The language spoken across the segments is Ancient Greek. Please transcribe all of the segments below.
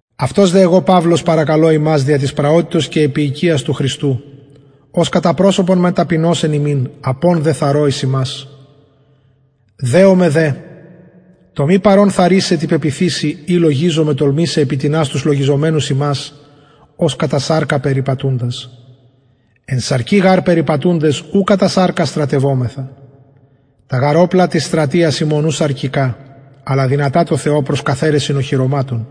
αυτος δε εγω παυλος παρακαλω υμας δια της πραοτητος και επιεικειας του χριστου ος κατα προσωπον μεν ταπεινος εν υμιν απων δε θαρρω εις υμας δεομαι δε το μη παρων θαρρησαι τη πεποιθησει η λογιζομαι τολμησαι επι τινας τους λογιζομενους ημας ως κατα σαρκα περιπατουντας εν σαρκι γαρ περιπατουντες ου κατα σαρκα στρατευομεθα τα γαρ οπλα της στρατειας ημων ου σαρκικα αλλα δυνατα τω θεω προς καθαιρεσιν οχυρωματων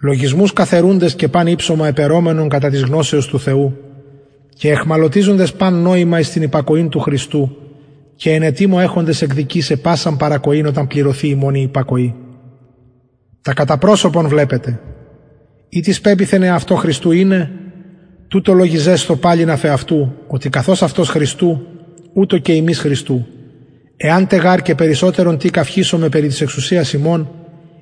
λογισμους καθαιρουντες και παν υψωμα επαιρομενον κατα της γνωσεως του θεου και αιχμαλωτιζοντες παν νοημα εις την υπακοην του χριστου και εν ετοιμω εχοντες εκδικησαι πασαν παρακοην οταν πληρωθη υμων η υπακοη τα κατα προσωπον βλεπετε ει τις πεποιθεν εαυτω χριστου ειναι τουτο λογιζεσθω παλιν αφ εαυτου οτι καθως αυτος χριστου ουτως και ημεις χριστου εαν τε γαρ και περισσοτερον τι καυχησωμαι περι της εξουσιας ημων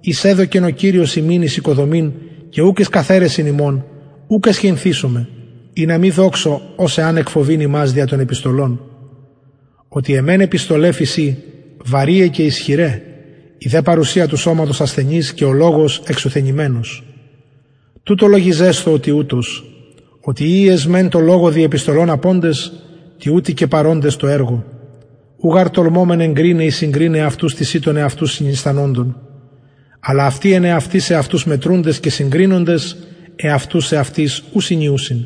ης εδωκεν ο κυριος ημιν εις οικοδομην και ουκ εις καθαιρεσιν υμων ουκ αισχυνθησομαι ινα μη δοξω ως αν εκφοβειν υμας δια των επιστολων οτι αι μεν επιστολαι φησιν βαρειαι και ισχυραι η δε παρουσια του σωματος ασθενης και ο λογος εξουθενημενος τουτο λογιζεσθω ο τοιουτος οτι οιοι εσμεν τω λογω δι επιστολων αποντες τοιουτοι και παροντες τω εργω ου γαρ τολμωμεν εγκριναι η συγκριναι εαυτους τισιν των εαυτους συνιστανοντων αλλα αυτοι εν εαυτοις εαυτους μετρουντες και συγκρινοντες εαυτους εαυτοις ου συνιουσιν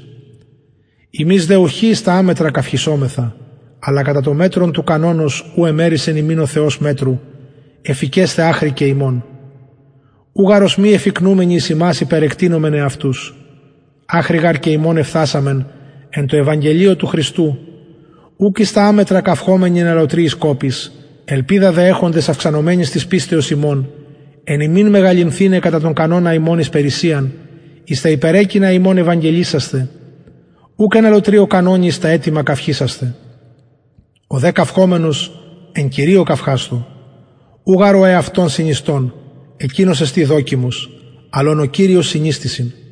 ημεις δε ουχι εις τα αμετρα καυχησομεθα αλλα κατα το μετρον του κανονος ου εμερισεν ημιν ο θεος μετρου εφικεσθαι αχρι και υμων ου γαρ ως μη εφικνουμενοι εις υμας υπερεκτεινομεν εαυτους αχρι γαρ και υμων εφθασαμεν εν τω ευαγγελιω του χριστου ουκ εις τα αμετρα καυχωμενοι εν αλλοτριοις κοποις ελπιδα δε εχοντες αυξανομενης της πιστεως υμων εν υμιν μεγαλυνθηναι κατα τον κανονα ημων εις περισσειαν εις τα υπερεκεινα υμων ευαγγελισασθαι ουκ εν αλλοτριω κανονι εις τα ετοιμα καυχησασθαι ο δε καυχωμενος εν κυριω καυχασθω ου γαρ ο εαυτον συνιστων εκεινος εστιν δοκιμος αλλ ον ο κυριος συνιστησιν